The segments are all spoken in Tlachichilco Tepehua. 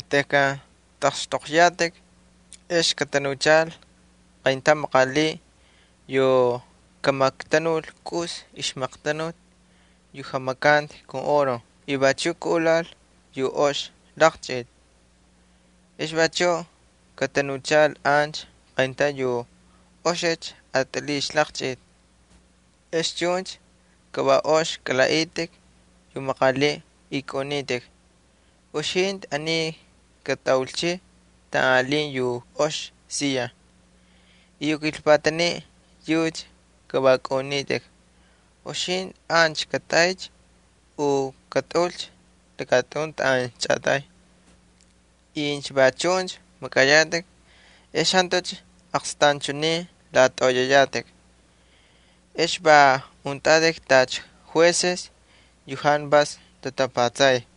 Tejkan tꞌaqxtꞌoqyatꞌik, ex katanuchal qayntaun maqaliꞌ yu kamaqtanul kꞌus ixmaqtanuti yu jamakanti kun oro y vachu kaꞌulal yu ox laqchꞌiti, ex vachuꞌ katanuchal ancha qayntaun yu oxicha atꞌaliꞌ ixlaqchꞌita, ex chuncha ka va ox kalaꞌaꞌitꞌik yu maqaliꞌ y kaꞌunitꞌik: “Uxintꞌi aniycha katꞌaulchiy taꞌan alin yu ox siya.” Ex yu kilpataniꞌ yucha ka va kaꞌunitꞌik: “Uxintꞌi ancha katꞌaycha u katꞌaꞌulcha lakatꞌun taꞌan chꞌatay.” Incha va chuncha makꞌayatꞌik ex jantucha aqstanchunin latꞌoꞌoyayatꞌik. Ex va untꞌatꞌik tacha jueces yu jantu vas tamakay.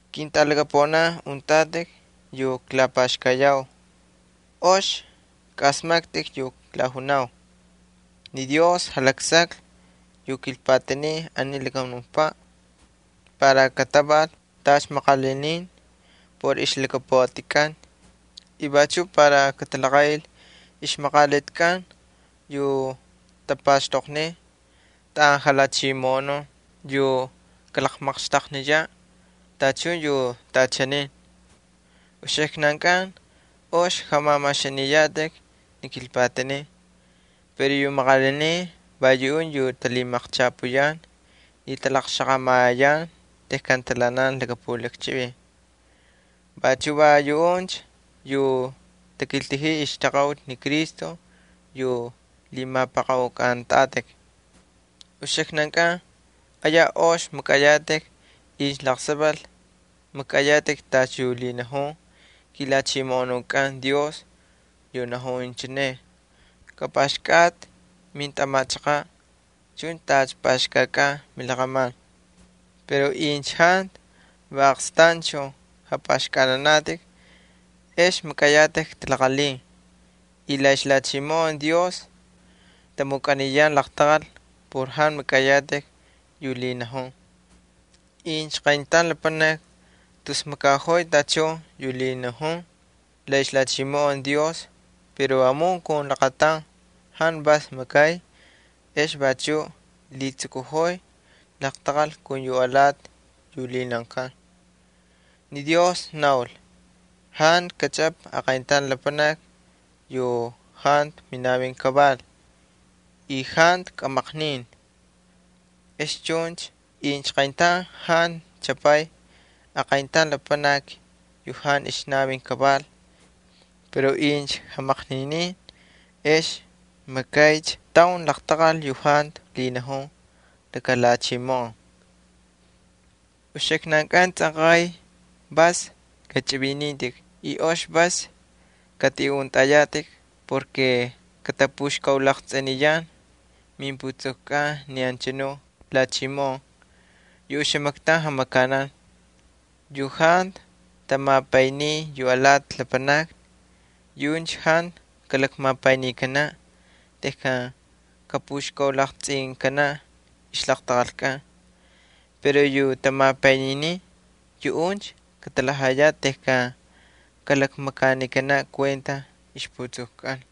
Ketꞌalaqaunin yu klapaxkayau, ox kꞌaꞌasmaktꞌik yu klajunau. Ni Dios jalaksaklhi yu kilpatanin aniy lakamunukpaꞌ para kataval tacha maqalinin por ixlhakapuꞌatikꞌan y vachuꞌ para katalaqaꞌil ixmaqalitikꞌan yu tapaxtoqniy taꞌan jalhachimoꞌonun, yu kamaqxtaqniyaꞌ tachun yu taꞌachaniy. Uxiknan ox jamamaxaniyatꞌik ni kilpatanin pero yu maqalinin va yuꞌuncha yu talhimaqchapuyan y talaqxaqamayan tejkan talhaꞌanan laka pulakchivin. Vachu va yuꞌuncha yu takiltajiy ixtaqaꞌuti ni Cristo yu lhimapꞌaqaꞌukꞌantꞌatꞌik. Uxiknankꞌan ayaj ox makꞌayatꞌik incha laqsaval makꞌayatꞌik tacha yu lhinajun kiJalhachimoꞌonukꞌan Dios yu najun inchineꞌ: “Kapꞌaxkꞌatꞌi mintꞌamachaqaꞌ chuncha tacha pꞌaxkꞌakꞌan milaqꞌaman.” Pero incha jantu va aqstanchun japꞌaxkꞌananatꞌik ex makꞌayatꞌik talaqalhin y la ixlhachimoꞌon Dios tamukꞌaniyan laqtaqal por jantu makꞌayatꞌik yu lhinajun. Incha qayntaun lapanaki tus makaꞌojoy tachun yu lhinajun la ixlhachimoꞌon Dios pero vamun kun laqataun jantu vas makay, ex vachuꞌ lhitsukuꞌojoy laqtaqal kun yu alati yu lhinaunkan. Ni Dios naul: “Jantu katꞌatꞌamatꞌi aqayntaun lapanaki yu jantu minavin kaval y jantu kꞌamaqnin.” Ex chuncha incha qayntaun jantu tꞌatamay aqayntaun yu jantu ixnavin kaval, pero incha jamaqninin ex makaycha taun laqtaqal yu jantu lhinajun laka lhachimoꞌon. Uxiknan tsꞌanqay vas kachꞌivinintꞌik y ox vas katꞌiꞌuntꞌayatꞌik porke katapuxkaulaqtsꞌiniyan mimputsukukꞌan ni anchanu lhachimoꞌon yu oxamaktaun jamakanan. Yu jantu tamapayniy yu alati lapanakni yuꞌuncha jantu kamapaynikanaꞌ tejkan kapuxkaulaqtsꞌinkanaꞌ ixlaqtaqalkꞌan. Pero yu tamapayninin, yuꞌuncha katalhajayaꞌ tejkan kalakmakanikanaꞌ kuenta ixputsukukꞌan.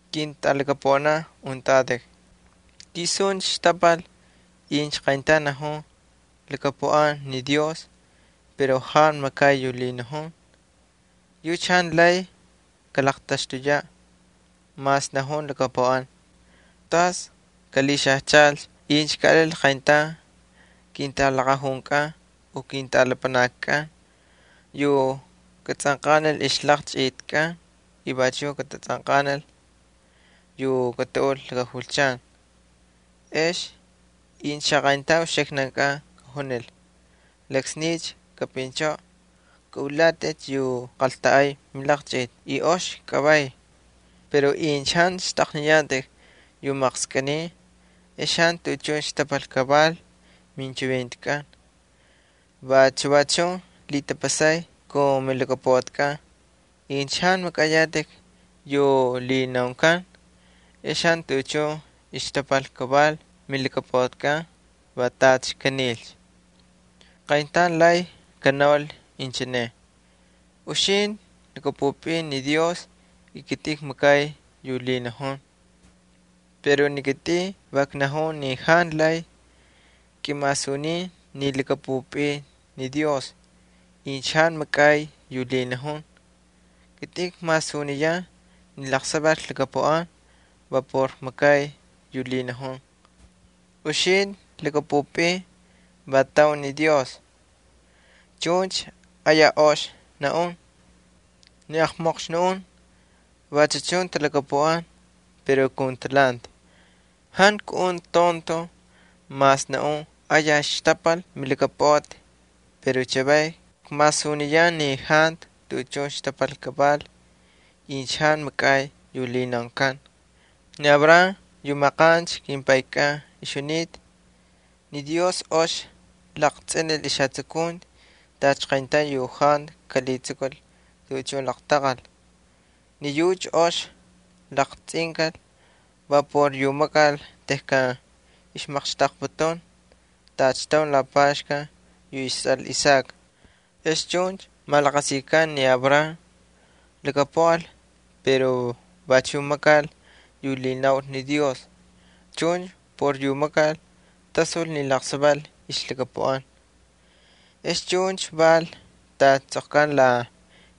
Ketꞌalaqaunin, ¿tisuncha xtapal incha qayntaun najun lhakapuꞌan ni Dios pero jantu makay yu lhinajun? Yucha jantu lay kalaqtaxtuyaꞌ mas najun lhakapuꞌan. ¿Tas kalhixajchalcha incha kaꞌalil qayntaun kintꞌalaqajunkꞌan u kintꞌalapanatkꞌan yu katatsꞌanqanil ixlaqchꞌitkꞌan y vachuꞌ katatsꞌanqanil yu kataꞌul laka julchan? Ex incha xaqayntaun uxiknankꞌan kajunil: “Laksniycha kapꞌinchꞌoꞌocha, kꞌaꞌulatꞌacha yu qaltanꞌay milaqchꞌiti y ox kꞌavay.” Pero incha jantu xtꞌaqniyatꞌik yu maqskꞌiniy ex jantu tuꞌuchun xtapal kaval minchivintikꞌan. Vachu chun lhitapasay kun milhakapuꞌatikꞌan, incha jantu makꞌayatꞌik yu lhinaunkan, ex jantu tuꞌuchun ixtapal kaval milhakapuꞌati, va tacha kanilcha. Qayntaun lay kanaul inchineꞌ: “Uxintꞌi lhakꞌapꞌupꞌin ni Dios y kitꞌin kmakay yu lhinajun.” Pero ni kitꞌin va knajun ni jantu lay kꞌimasunin ni lhakꞌapꞌupꞌin incha jantu makꞌay yu lhinajun. Kitꞌin kmasuniyan ni laqsaval klhakapuꞌan va por kmakay yu lhinajun. Uxintꞌi lhakꞌapꞌupꞌin ni Dios va laqataun alin. Chuncha ox makꞌay. Ni aqmoqxnun vachu chun talhakapuꞌan pero kun talhanti. Jantu kaꞌuntꞌi tontoj, mas naꞌun ayaj xtapal milhakapuꞌati pero chavay kmasuniyan ni jantu tuꞌuchun xtapal kaval incha jantu makꞌay yu lhinaunkan. Ni Abraham yu maqancha kimpaykꞌan ixjunita, ni Dios ox laqtsꞌinil ixjatsukunti tacha qayntaun yu jantu kalhitsukul tuꞌuchun laqtaqal. Ni yucha ox laqtsꞌinkal va por yu makal tejkan ixmaqxtaqputun tacha taun lapaxkan yu istsꞌal Isaac. Ex chuncha malaqasikan ni Abraham lhakapuꞌal pero vachuꞌ makal yu lhinaul ni Dios. Chuncha por yu makal tasul ni laqsaval ixlhakapuꞌan. Ex chuncha val tacha tsꞌoqkanta la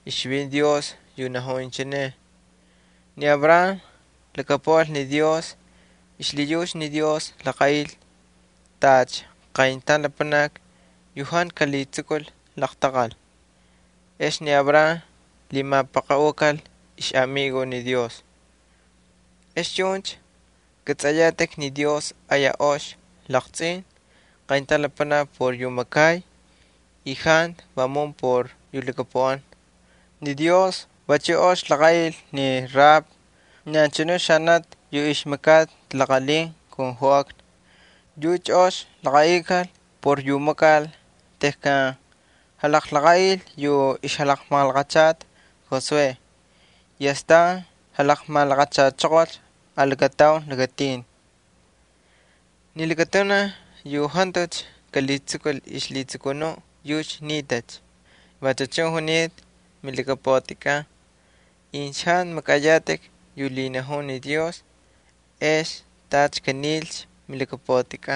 ixchivinti Dios yu najun inchineꞌ: “Ni Abraham lhakapuꞌal ni Dios xlhiyucha ni Dios laqaꞌil tacha qayntaun lapanaki yu jantu kalhitsukul laqtaqal.” Ex ni Abraham lhimapaqaꞌukal ixꞌamigo ni Dios. Ex chuncha kꞌatsꞌayatꞌik ni Dios ayaj ox laqtsꞌin qayntaun lapanaki por yu makay y jantu vamun por yu lhakapuꞌan. Ni Dios vachu ox laqaꞌil ni Rahab, ni anchanu xanati yu ixmakata talaqalhin kun joꞌakna. Yucha ox laqaꞌikal por yu makal tejkan jalaqaꞌil yu ixjalaqmalaqachata Josué ex astan jalaqmalaqachachoqolcha alakataun lakatin. Ni lakatunaj yu jantucha kalhitsukul ixlhitsukunuꞌ yucha nitacha. Vachu chun junita milhakapuꞌati incha jantu makꞌay yu lhinajun ni Dios ex tacha kanilcha milhakapuꞌati.